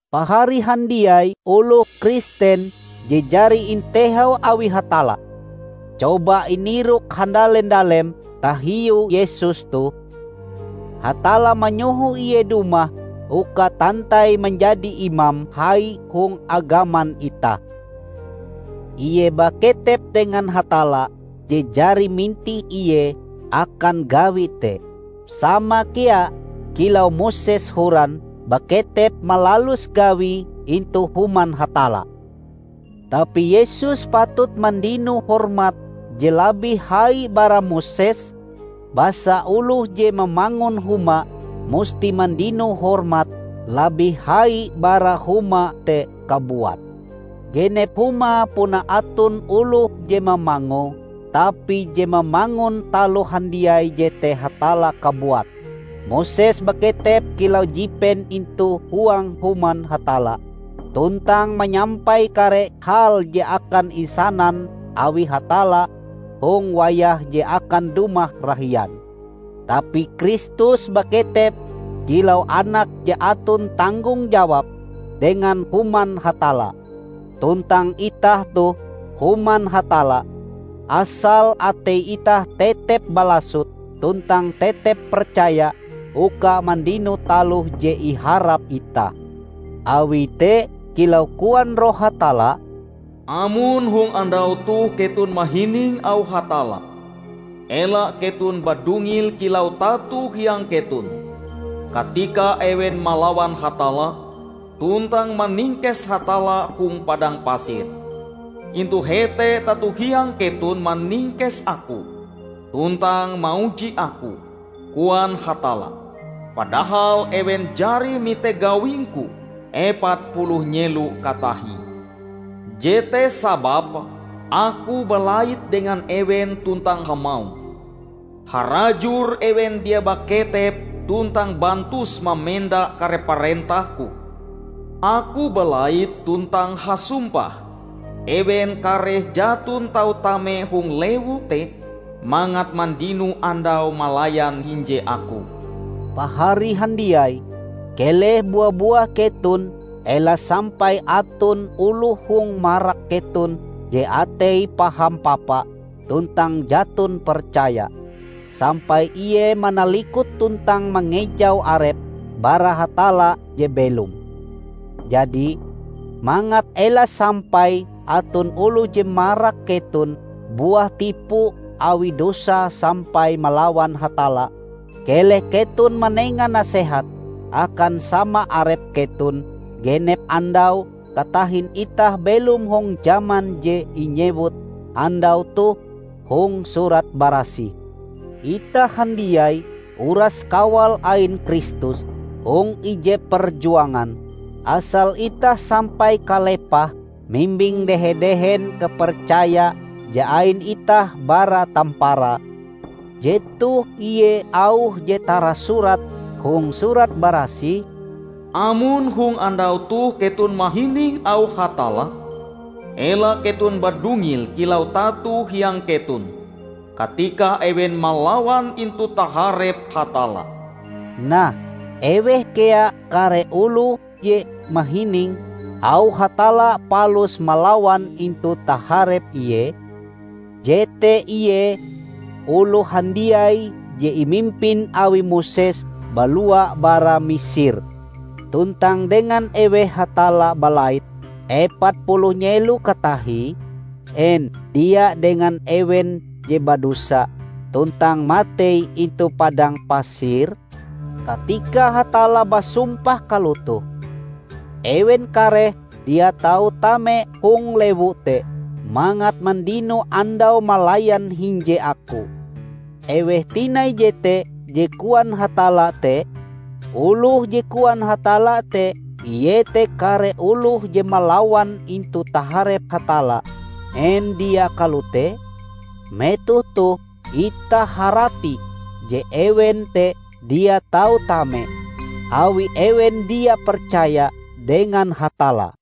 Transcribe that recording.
Pahari handiai oloh Kristen je jari intehau awi Hatalla! Coba inirok handale-ndalem tahiu Yesus toh! Hatalla manyoho Ie dumah uka tantai manjadi Imam Hai hong agaman itah. Ie baketep dengan Hatalla je jari mintih Ie akan gawi te, sama kea kilau Moses horan baketep malalus gawie intu Human Hatalla. Tapi Yesus patut mandino hormat je labih hai bara Moses. Basa oloh je mamangun huma musti mandino hormat labih hai bara huma te kabuat. Genep huma puna aton oloh je mamangue, tapi je mamangun taloh handiai jete Hatalla kabuat. Moses baketep kilau jipen intu huang Human Hatalla tuntang manyampai kare hal je akan insanan awi Hatalla hong wayah je akan dumah rahian. Tapi Kristus baketep kilau Anak je aton tanggong jawab dengan Human Hatalla. Tuntang itah toh Human Hatalla, asal atei itah tetep balasot tuntang tetep percaya uka mandino taloh je iharap itah. Awi te, kilau koan Roh Hatalla, "Amon hong andau toh keton mahining auh Hatalla, ela keton badungil kilau tato hiang keton, katika ewen malawan Hatalla, tuntang maningkes Hatalla hong padang pasir. 'Intu hete tato hiang keton maningkes Aku, tuntang mauji Aku,' koan Hatalla, 'padahal ewen jari mite gawing-Ku epat puluh nyelo katahie.' Jete sababe Aku balait dengan ewen tuntang hamauh, 'Harajur ewen dia baketep, tuntang bantus mamenda kare parentah-Ku.' Aku balait tuntang hasumpah, 'Ewen kareh jaton tau tame hong lewu te mangat mandino andau malayan hinje Aku.' " Pahari handiai, keleh bua-buah keton ela sampai aton oloh hong marak keton je ateie paham papa tuntang jaton percaya, sampai Ie manalikut tuntang mangejau arepe bara Hatalla je belom! Jadi, mangat ela sampai aton oloh je marak keton buah tipu awi dosa sampai malawan Hatalla, keleh keton manenga nasehat akan sama arep keton genep andau katahin itah belom hong jaman je inyewut "Andau toh" hong Surat Barasih. Itah handiai uras kawal ain Kristus hong ije perjuangan, asal itah sampai kalepahe mimbing dehe-dehen kapercaya je ain itah bara tamparae. Jetoh ie auh je tarasurat hong Surat Barasih, "Amon hong andau toh keton mahining auh Hatalla, ela keton badungil kilau tato hiang keton, katika ewen malawan intu taharep Hatalla." Nah, eweh kea kare oloh te je mahining auh Hatalla palus malawan intu taharep Ie? Jete ie oloh handiai je imimpin awi Moses balua bara Misir. Tuntang dengan eweh Hatalla balait epat puluh nyelo katahie? En dia dengan ewen je badosa tuntang matei intu padang pasir? Katika Hatalla basumpah kalotoh, "Ewen kareh dia tau tame hong lewu te mangat mandino andau malayan hinje Aku" -- eweh tinai jete je koan Hatalla te? Oloh je koan Hatalla te iete kare oloh je malawan intu taharep Hatalla, en dia kalote? Metoh toh itah harati je ewen te dia tau tame, awi ewen dia percaya dengan Hatalla.